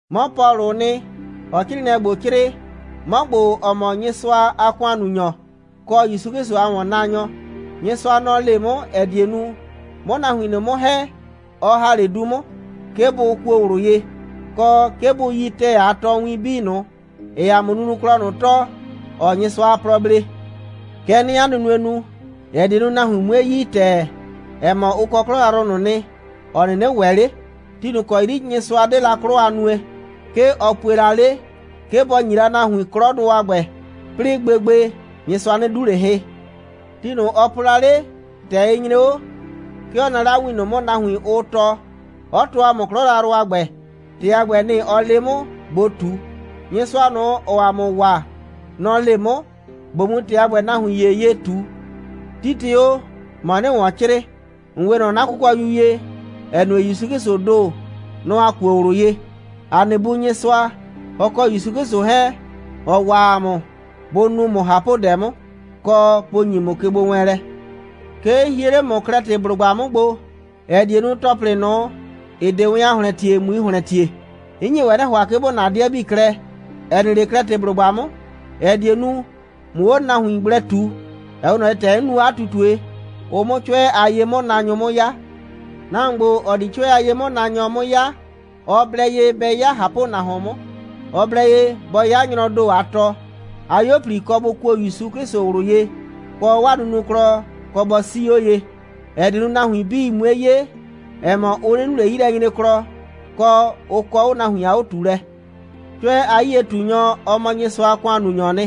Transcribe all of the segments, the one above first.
'Mɔ Pɔlʋʋ nɩ, ‑ɔɔ 'crɩɩnɩɛ ‑gbo 'crɩɩ, 'mɔ ‑gbo, ‑ɔ mɔ Nyɩsʋa a ‑kʋannunyɔ, kɔ ‑Yusu 'Klɩsʋ a ‑wɔnnaanyɔ. Nyɩsʋa, nɔ‑ le 'mʋ, ‑ɛ die nu, 'mʋ nahuin ꞊nʋ 'mʋ ‑hɛ, ɔ ‑ha 'le du 'mʋ, 'ke bʋ kuo ꞊wlʋ ye, kɔ, 'ke bʋ yi ‑tɛɛ a tɔɔwin 'bii ꞊nʋ, ‑ɩɩ ‑a mʋ nunuklɔ ꞊nʋ tɔɔ, ‑ɔɔ Nyɩsʋa a plɔ blee. Kɛ 'nɩɩ 'a nunue nu, ‑ɛ die nu, nahuin 'mue yi ‑tɛɛ, ‑ɛ mɔ, ʋ kɔ 'klɔ yrayrʋ ꞊nʋ nɩ, ‑ɔ 'nɩnɩ ‑wɛ 'le. Ti ꞊nʋ ‑kɔ 'yri Nyɩsʋa 'de la 'klɔ a nue, 'ke ɔ pue la 'le, 'ke bɔ ‑nyi la nahuin 'klɔdʋ a ‑gbɛ. 'Plɩɩ gbegbe, Nyɩsʋa 'nɩ 'du ꞊le hɩ. Ti ꞊nʋ, ɔ po la 'le, ‑tɛ ɩ nyre 'o, 'ke ɔ naa 'le 'a win ꞊nʋ 'mʋ, nahuin, ʋʋ tɔɔ, 'ɔ tɔɔ ‑a mʋ 'klɔ yrayrʋ a ‑gbɛ. ‑Tɩ a ‑gbɛ, nɩ‑ ɔ le 'mʋ, ꞊bo ꞊tu. Nyɩsʋa ꞊nʋ, ‑ɔɔ ‑a mʋ waa, nɔ‑ le 'mʋ, ꞊bo mu ‑tɩ a ‑gbɛ nahuin ‑ye ye ꞊tu. Titɩ o, ‑mɔ 'nɩɩ ‑wɔn 'crɩɩ. ‑N 'we ꞊nɔ 'na kʋkɔyu ye, ‑ɛ nue, ‑Yusu 'Klɩsʋʋ ‑do, nɔ‑ ‑a kuo ꞊wlʋ ye. ‑A nɩ Bu Nyɩsʋa, ɔ kɔ ‑Yusu 'Klɩsʋ 'hɛɛn, ‑ɔ waa ‑a mʋ, bʋ nu ‑mʋ ꞊hapʋdɛ 'mʋ, kɔ, bʋ ‑nyi ‑mʋ kegbowɛɛnlɛ. 'Ke 'n hie 'le ‑mʋ Klɛtɩblʋgba 'mʋ gbo, ‑ɛ die nu, ‑tɔplɩ ꞊nʋ, ‑ɩ 'de wɛn a ‑hlɛntiee, ꞊mui ‑hlɛntie. 'N nye ‑wɛ 'nɩ ‑hʋa, 'ke ‑bo na 'dɩɛ 'bii klɛ, ‑ɛ nɩ 'le Klɛtɩblʋgba 'mʋ, ‑ɛ die nu, ꞊mʋ 'o nahuin gblɛ ꞊tu, ‑ɛ 'we ꞊nɔ ye, ‑tɛ 'n nu o 'a ꞊tutue, ʋ 'mʋ 'cʋɛ a ye'mʋnaanyʋ 'mʋ 'ya. Nahuon ‑gbo, ‑ɔ di 'cʋɛ a ye'mʋnaanyɔ 'mʋ 'ya, ɔ blɛ ye bɛ 'ya ꞊hapʋnahuon 'mʋ. Ɔ blɛ ye bɔ 'ya nyrɔɔ ‑do a tɔ. 'A 'yuo꞊pli kɔ bʋ kuo ‑Yusu 'Klɩsʋ ꞊wlʋ ye, kɔ, 'waa nunuklɔ kɔ bɔ 'sii 'o ye, ‑ɛ die nu, nahuin 'bii 'mue 'ye, ‑ɛ mɔ, ʋ 'nɩ nu ꞊le 'yilɛnyreklɔ, kɔ, ʋ kɔ 'o nahuin a 'o꞊tuulɛ. 'Cʋɛ a 'yie꞊tunyɔ, ɔ mɔ Nyɩsʋa a ‑kʋannunyɔɔ nɩ.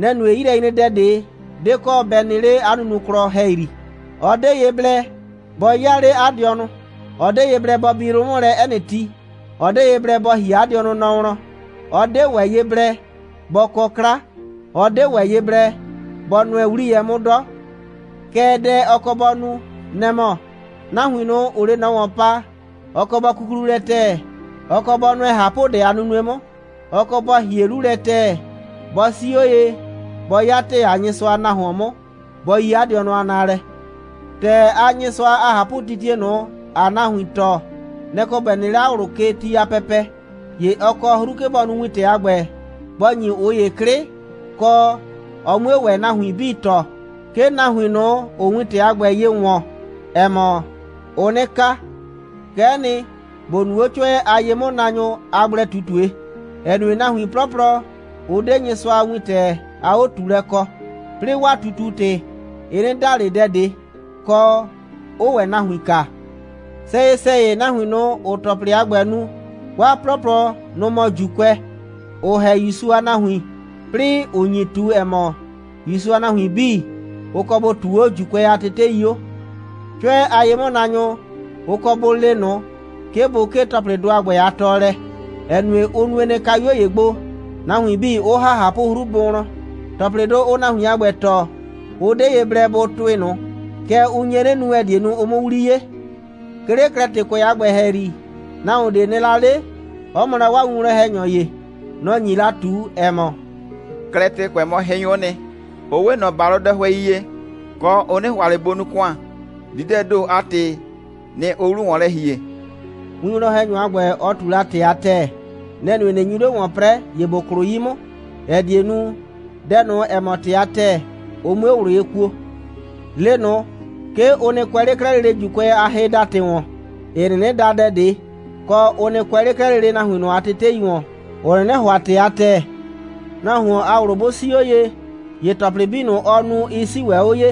Nɛ‑ nue, 'yilɛnyredɛ ꞊de 'de kɔ bɛ nɩ 'le 'a nunuklɔ ‑hɛyri. Ɔ 'de ye blɛ bɔ 'yaa 'le 'a dɩɔnʋ. Ɔ 'de ye blɛ bɔ bi yrʋ 'mʋ lɛ 'ɛ nɩ ti. Ɔ 'de ye blɛ bɔ ‑hie 'a dɩɔnʋ nɔ wlɔn. Ɔ 'de ‑wɛ ye blɛ bɔ kɔ 'kla. Ɔ 'de ‑wɛ ye blɛ bɔ nʋɛ 'wliyɛ 'mʋ 'dɔ. Kɛɛ, dɛ ɔ kɔ bɔ nu, nɛ‑ mɔ: nahuin ꞊nʋ, ‑ʋʋ 'le ꞊nɔ ‑wɔn pa, ɔ kɔ bɔ kuklu lɛ ‑tɛɛ. Ɔ kɔ bɔ nʋɛ ꞊hapʋdɛ a nunue 'mʋ. Ɔ kɔ bɔ ‑hie 'lu lɛ ‑tɛɛ. Bɔ 'sii 'o ye, bɔ 'ya ‑tɛɛ a Nyɩsʋa a nahuon 'mʋ, bɔ yi 'a dɩɔnʋ a naalɛ. ‑Tɛɛ a Nyɩsʋa a ꞊hapʋtitie ꞊nʋ, ‑aa nahuin tɔɔ, nɛ‑ kɔ ‑bɛ nɩ 'le 'a ꞊wlʋ ke ti a pɛpɛ. ‑Ye ɔ kɔ 'hru, 'ke bɔ nu wintɛ a ‑gbɛ, bɔ ‑nyi ꞊ʋ ‑ye 'klɩ, kɔ, ɔ 'mue ‑wɛ nahuin 'bii tɔɔ, 'ke nahuin ꞊nʋ, ‑ʋʋ wintɛ a ‑gbɛ ye ‑wɔn, ‑ɛ mɔ, ʋʋ 'nɩ ka. Kɛ'ɛ nɩ, ‑bo nu 'o 'cʋɛ a ye'mʋnaanyʋ a gblɛ꞊tutue, ‑ɛ nue, nahuin 'plɔplɔ, ʋ 'de Nyɩsʋa a wintɛ a 'o꞊tuulɛ kɔ, 'plɩɩ 'waa ꞊tutu‑tɩ, ɩ 'nɩ da ꞊le dɛ ꞊de, kɔ, 'ʋʋ ‑wɛ nahuin kaa. Sɛyɩ‑sɛyɩ, nahuin ꞊nʋ, ‑ʋʋ ‑tɔplɩ a ‑gbɛ nu, 'waa 'plɔplɔ, nʋ‑ mɔ ‑Juukʋɛ, ‑ʋ ‑hɛ ‑Yusu a nahuin, 'plɩɩ ‑ʋ nyi ꞊tu, ‑ɛ mɔ, ‑Yusu a nahuin 'bii, ʋ kɔ bʋ ꞊tuu 'o ‑Juukʋɛ a tetei 'o. 'Cʋɛ a ye'mʋnaanyʋ, ʋ kɔ bʋ le ꞊nʋ, 'ke bʋ 'kee ‑tɔplɩdʋ a ‑gbɛ a tɔɔlɛ, ‑ɛ nue, ʋ nue nɩ, kayuo ‑ye gbo, nahuin 'bii 'ʋ ‑ha ꞊hapʋ'hru bʋ wlɔn. ‑Tɔplɩdʋ, ʋʋ nahuin a ‑gbɛ tɔɔ, ʋ 'de ye blɛ bʋ tʋɩ ꞊nʋ. Kɛɛ, ʋ nye 'nɩ nu, ‑ɛ die nu, ʋ 'mʋ 'wli 'ye. 'Ke 'le Klɛtɩkʋɛ a ‑gbɛ ‑hɛyri, nahuon ꞊de nɩ la 'le, 'ɔ mɔ la 'waa winwlɔn‑hɛnyɔ ‑ye. Nɔ‑ nyi la ꞊tu, ‑ɛ mɔ: «Klɛtɩkʋɛ mɔ hɩnyʋ'ʋ nɩ, ʋ 'we ꞊nɔ ‑balʋdɛhʋɛi ye, kɔ, ʋ 'nɩ ‑hʋa ꞊le bʋ nu ‑kʋan. Dididɛɛ ‑do a ‑tɩ, nɩ‑ ʋʋ 'lu ‑wɔn lɛ ‑hie.» Winwlɔn‑hɛnyɔ a ‑gbɛ, ɔ ꞊tu la ‑tɩ a ‑tɛɛ. Nɛ‑ nue, ꞊nɩ nyu 'le ‑wɔn 'prɛɛ, ‑ye ‑bo klʋ 'yi 'mʋ, ‑ɛ die nu, dɛ ꞊nʋ, ‑ɛ mɔ ‑tɩ a ‑tɛɛ, ʋ 'mue ꞊wlʋ ye kuo. Le ꞊nʋ, 'ke ʋ nɩ kʋɛ 'le 'klɛɛ lele ‑Juukʋɛ a hɩdatɩgbɩ ‑wɔn, ‑ɩ 'nɩnɩ da dɛ ꞊de, kɔ, ʋ nɩ kʋɛ 'le 'klɛɛ lele nahuin ꞊nʋ a tetei ‑wɔn, ‑ʋ 'nɩnɩ ‑hʋa ‑tɩ a ‑tɛɛ. Nahuon a ꞊wlʋ 'bʋ 'sii 'o ye, ‑ye ‑tɔplɩ 'bii ꞊nʋ, ɔɔ nu, ɩ 'sii ‑wɛ 'o ye.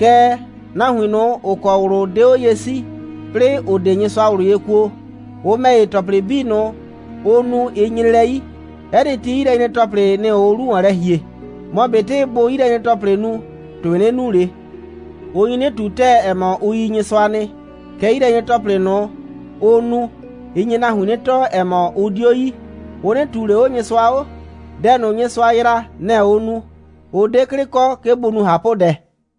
Kɛɛ, nahuin ꞊nʋ, ‑ʋ kɔ ꞊wlʋ 'de 'o ye 'sii, 'plɩɩ ‑ʋ 'de Nyɩsʋa ꞊wlʋ ye kuo, ʋ ‑mɛ ‑ye, ‑tɔplɩ 'bii ꞊nʋ, ʋʋ nu, ɩ nyre lɛ 'yi. 'Ɛ nɩ ti, 'yilɛnyre‑tɔplɩ, nɩ‑ ʋʋ 'lu ‑wɔn lɛ ‑hie. Mɔ ꞊betɩ bʋʋ 'yilɛnyre‑tɔplɩ nu, ‑tʋɩ 'nɩ nu ꞊le. Ʋ nyi 'nɩ ꞊tu ‑tɛɛ, ‑ɛ mɔ, ʋ yi Nyɩsʋa nɩ, kɛɛ, 'yilɛnyre‑tɔplɩ ꞊nʋ, ʋʋ nu, ɩ nye nahuin 'nɩ tɔɔ, ‑ɛ mɔ, ʋ 'dio yi. Ʋ 'nɩ ꞊tuu ꞊le 'o Nyɩsʋa 'o. Dɛ ꞊nʋ, Nyɩsʋa yraa, nɛ‑ ʋʋ nu. Ʋ 'de 'klɩ kɔ, 'ke bʋ nu ꞊hapʋdɛ.